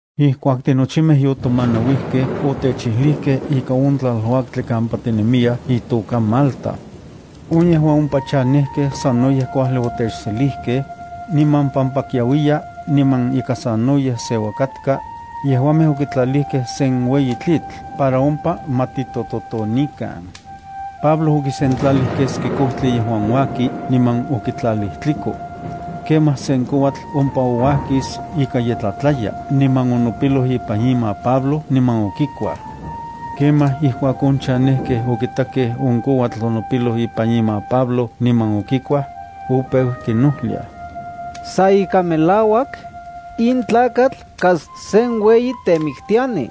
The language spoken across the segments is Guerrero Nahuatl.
Ijkuak tinochimej yotomanauijkej otechijlijkej ika on tlaluaktli kampa tinemiyaj itoka Malta. On yejuan ompa chanejkej sanoyej kuajli otechselijkej. Niman pampa kiauiya niman ika sanoyej seua katka, yejuamej okitlalijkej sen ueyi tlitl para ompa ma titototonikan. Pablo okisentlalij keski kojtli yejuan uaki niman okontlalij tliko. Kemaj sen kouatl ompa ouajkis ika ye tlatlaya niman onopiloj ipan ima Pablo niman okikuaj. Kemaj ijkuak on chanejkej okitakej on kouatl onopiloj ipan ima Pablo niman okikuaj, opeu kinojliaj: —Sa ika melauak, in tlakatl kas sen ueyi temiktiani.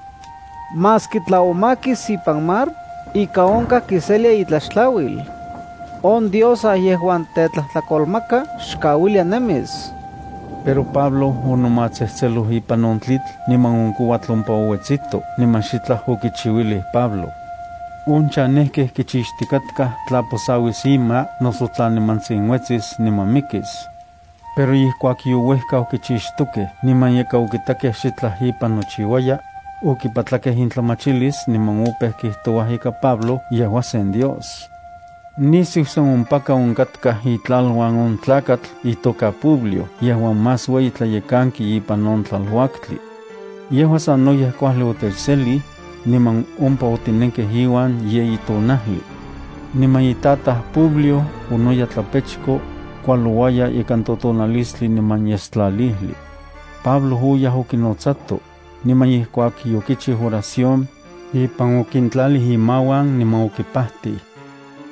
Maski tla omakis ipan mar, ika onkaj kiselia itlaxtlauil. On diosa yejuan tetlajtlakolmaka xkauilia nemis. Pero Pablo onomatsejtseloj ipan on tlitl niman on kouatl ompa ouetsito niman xitlaj okichiuilij Pablo. On chanejkej kichixtikatkaj tla posauis ima noso tla nimantsin uetsis niman mikis. Pero ijkuak youejkau kichixtokej niman ika okitakej xitlaj ipan nochiuaya, okipatlakej intlamachilis niman opeu kijtouaj ika Pablo yejua sen dios. Nisiu sa ompaka onkatkaj itlaluan on tlakatl itoka Publio yejuan más ueyi tlalekanki ipan on tlaluaktli. Yejua sanoyej kuajli otechselij, niman ompa otinenkej iuan yeyi tonajli. Niman itataj Publio onoya tlapechko, kualouaya ikan totonalistli niman yestlalijli. Pablo oyaj okinotsato, niman ijkuak yokichiu oración, ipan okintlalij imauan niman okipajtij.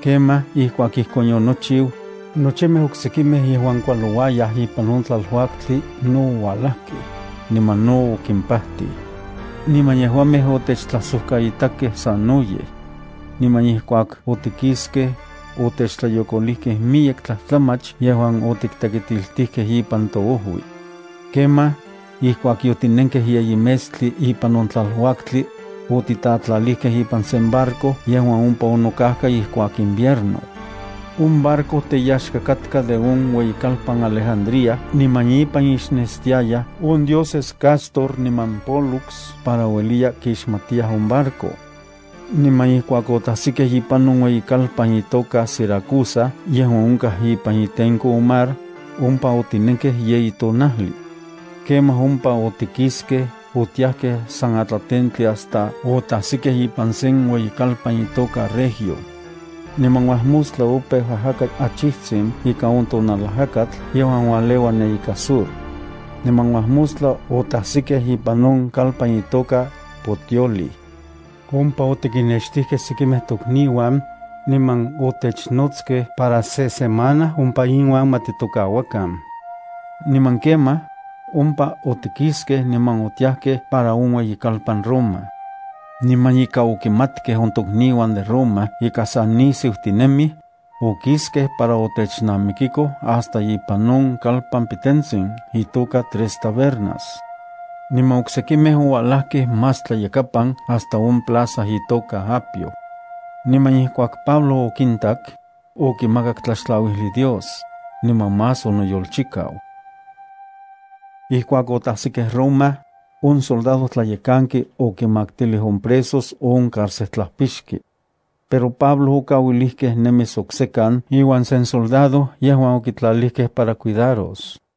Kemaj ijkuak ijkon yonochiu, nochimej oksekimej yejuan kualoj ipan on tlaluaktli no ouajlakej, niman no okimpajtij. Niman yejuamej otechtlajsojkaitakej sanoyej. Niman ijkuak otikiskej, otechtlayokolijkej miyek tlajtlamach yejuan otiktekitiltijkej ipan toojui. Kemaj, ijkuak yotinenkej yeyi metstli ipan on tlaluaktli, otitatlalijkej ipan sen barco yejuan ompa onokajka ijkuak invierno. On barco teyaxka katka de on ueyikalpan Alejandría niman ipan ixnestiayaj on dioses Cástor niman Pólux para ueliya kixmatiyaj on barco. Niman ijkuak otajsikej ipan on ueyikalpan itoka Siracusa yejuan onkaj ipan itenko on mar, ompa otinenkej yeyi tonajli. Kemaj ompa otikiskej otiajkej san atlatentli hasta otajsikej ipan sen ueyikalpan itoka Regio. Niman uajmostla opeu ajaka achijtsin ika on tonalajakatl yejuan uajleua ne ika sur. Niman uajmostla, otajsikej ipan on kalpan itoka Puteoli. Ompa otikinnextijkej sekimej tokniuan, niman otechnotskej para se semana ompa inuan ma titokauakan. Niman kemaj, ompa otikiskej niman otiajkej para on ueyikalpan Roma. Niman ika okimatkej on tokniuan de Roma ika sa nisiu tinemij, okiskej para otechnamikikoj hasta ipan on kalpan pitentsin itoka Tres Tabernas. Niman oksekimej oualajkej más tlayakapan hasta on plaza itoka Apio. Niman ijkuak Pablo okintak, okimakak tlaxtlauijli Dios, niman más onoyolchikau. Ijkuak otajsikej Roma, on soldadojtlayekanki okinmaktilij on presos on carcejtlapixki. Pero Pablo okauilijkej nemis oksekan iuan sen soldado yejuan okitlalijkej para cuidaros.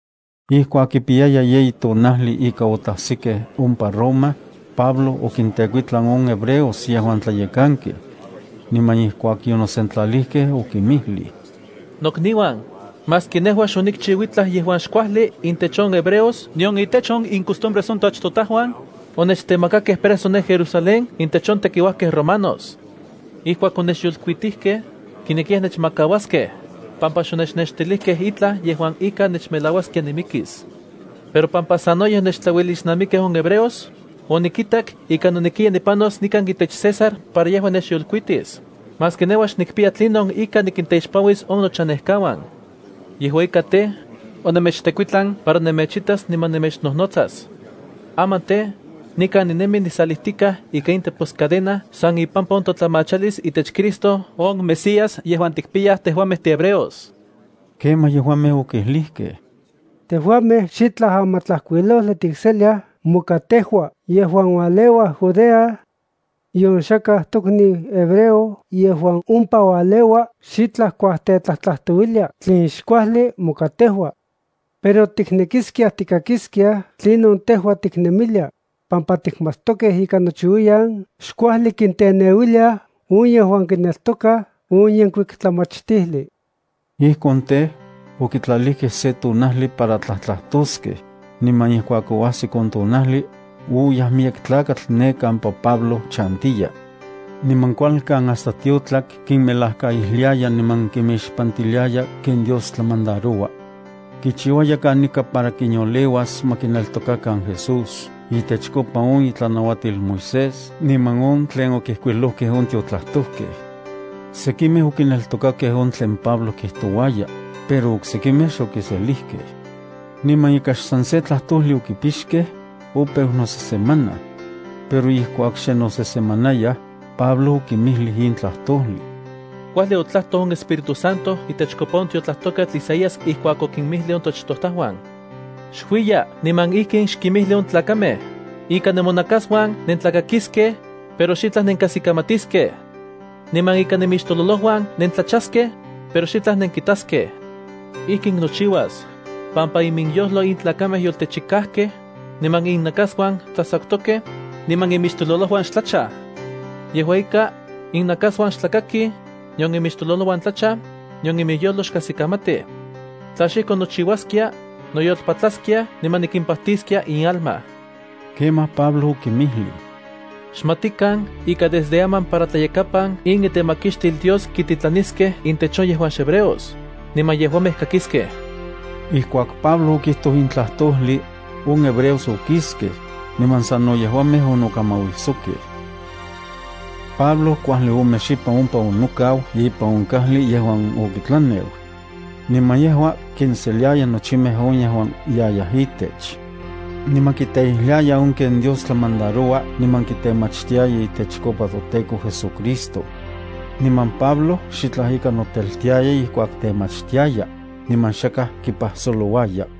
Ijkuak kipiyaya yeyi tonajli ika otajsikej ompa Roma, Pablo okintekuitlan on hebreos yejuan tlayekankej. Niman ijkuak yonosentlalijkej, okinmijlij: —Nokniuan, maski nejua xonikchiu itlaj yejuan xkuajli intech on hebreos nion itech on incostumbres on toachtojtajuan, onechtemakakej preso ne Jerusalén intech on tekiuajkej romanos. Ijkuak onechyolkuitijkej, kinekiyaj nechmakauaskej, pampa xonechnextilijkej itlaj yejuan ika nechmelauaskia nimikis. Pero pampa sanoyej onechtlauelixnamikkej on hebreos, onikitak ika nonekiya nipanos nikan itech César para yejua nechyolkuitis, maski nejua xnikpiya tlinon ika nikinteixpanuis on nochanejkauan. Yejua ika tej, onemechtekuitlan para nemechitas niman nemechnojnotsas. Aman tej, nikan ninemi nisalijtikaj ika in teposcadena san ipampa on totlamachalis itech Cristo on Mesías yejuan tikpiyaj tejuamej tihebreos. Kemaj yejuamej okijlijkej: —Tejuamej xitlaj amatlajkuilojli tikseliaj moka tejua yejuan ualeua Judea. Nion xakaj tokniu hebreo yejuan ompa ualeua xitlaj kuajtetlajtlajtouiliaj tlen xkuajli moka tejua. Pero tiknekiskiaj tikakiskiaj tlinon tejua tiknemilia, pampa tikmatstokej ika nochiuiyan xkuajli kinteneuiliaj on yejuan kineltokaj on yenkuik tlamachtijli. Ijkon tej, okitlalijkej se tonajli para tlajtlajtoskej, niman ijkuak oajsik on tonajli, oyaj miyek tlakatl ne kampa Pablo chantiya. Niman kualkan hasta tiotlak kinmelajkaijliaya niman kimixpantiliaya ken Dios tlamandaroua. Kichiuaya kanika para kinyoleuas ma kineltokakan Jesús itechkopa on itlanauatil Moisés niman on tlen okijkuilojkej on tiotlajtojkej. Sekimej okineltokakej on tlen Pablo kijtouaya, pero oksekimej xokiselijkej. Niman ika xsan se tlajtojli okipixkej, opeu nosesemanaj. Pero ijkuak xe nosesemanayaj, Pablo okinmijlij in tlajtojli: —Kuajli otlajtoj on Espíritu Santo itechkopa on tiotlajtojketl Isaías ijkuak okinmijlij on toachtojtajuan: Xuiya niman ijkin xkinmijli on tlakamej: Ika nemonakasuan nentlakakiskej, pero xitlaj nenkajsikamatiskej. Niman ika nemixtololojuan nentlachaskej, pero xitlaj nenkitaskej. Ijkin nochiuas, pampa iminyojlo in tlakamej yotechikajkej, niman innakasuan tsajtsakutokej, niman imixtololojuan xtlachaj. Yejua ika, innakasuan xtlakakij, nion imixtololojuan tlachaj, nion iminyojlo kajsikamati. Tla xijkon nochiuaskia, noyolpatlaskiaj, niman nikimpajtiskia inalma. Kemaj Pablo okinmijlij: —Xmatikan ika desde aman para tlayakapan in itemakixtil Dios kititlaniskej intech on yejuan xhebreos, niman yejuamej kakiskej. Ijkuak Pablo okijtoj in tlajtojli, on hebreos okiskej, niman sano yejuamej onokamauijsokej. Pablo kuajli ome xipan ompa onokau ipan on kajli yejuan okitlaneu. Niman yejua kinseliaya nochimej on yejuan yayaj itech. Niman kiteijliaya on ken Dios tlamandaroua niman kitemachtiaya itechkopa toTEKO JesuCristo. Niman Pablo xitlaj ika noteltiaya ijkuak temachtiaya, niman xakaj kipajsolouaya.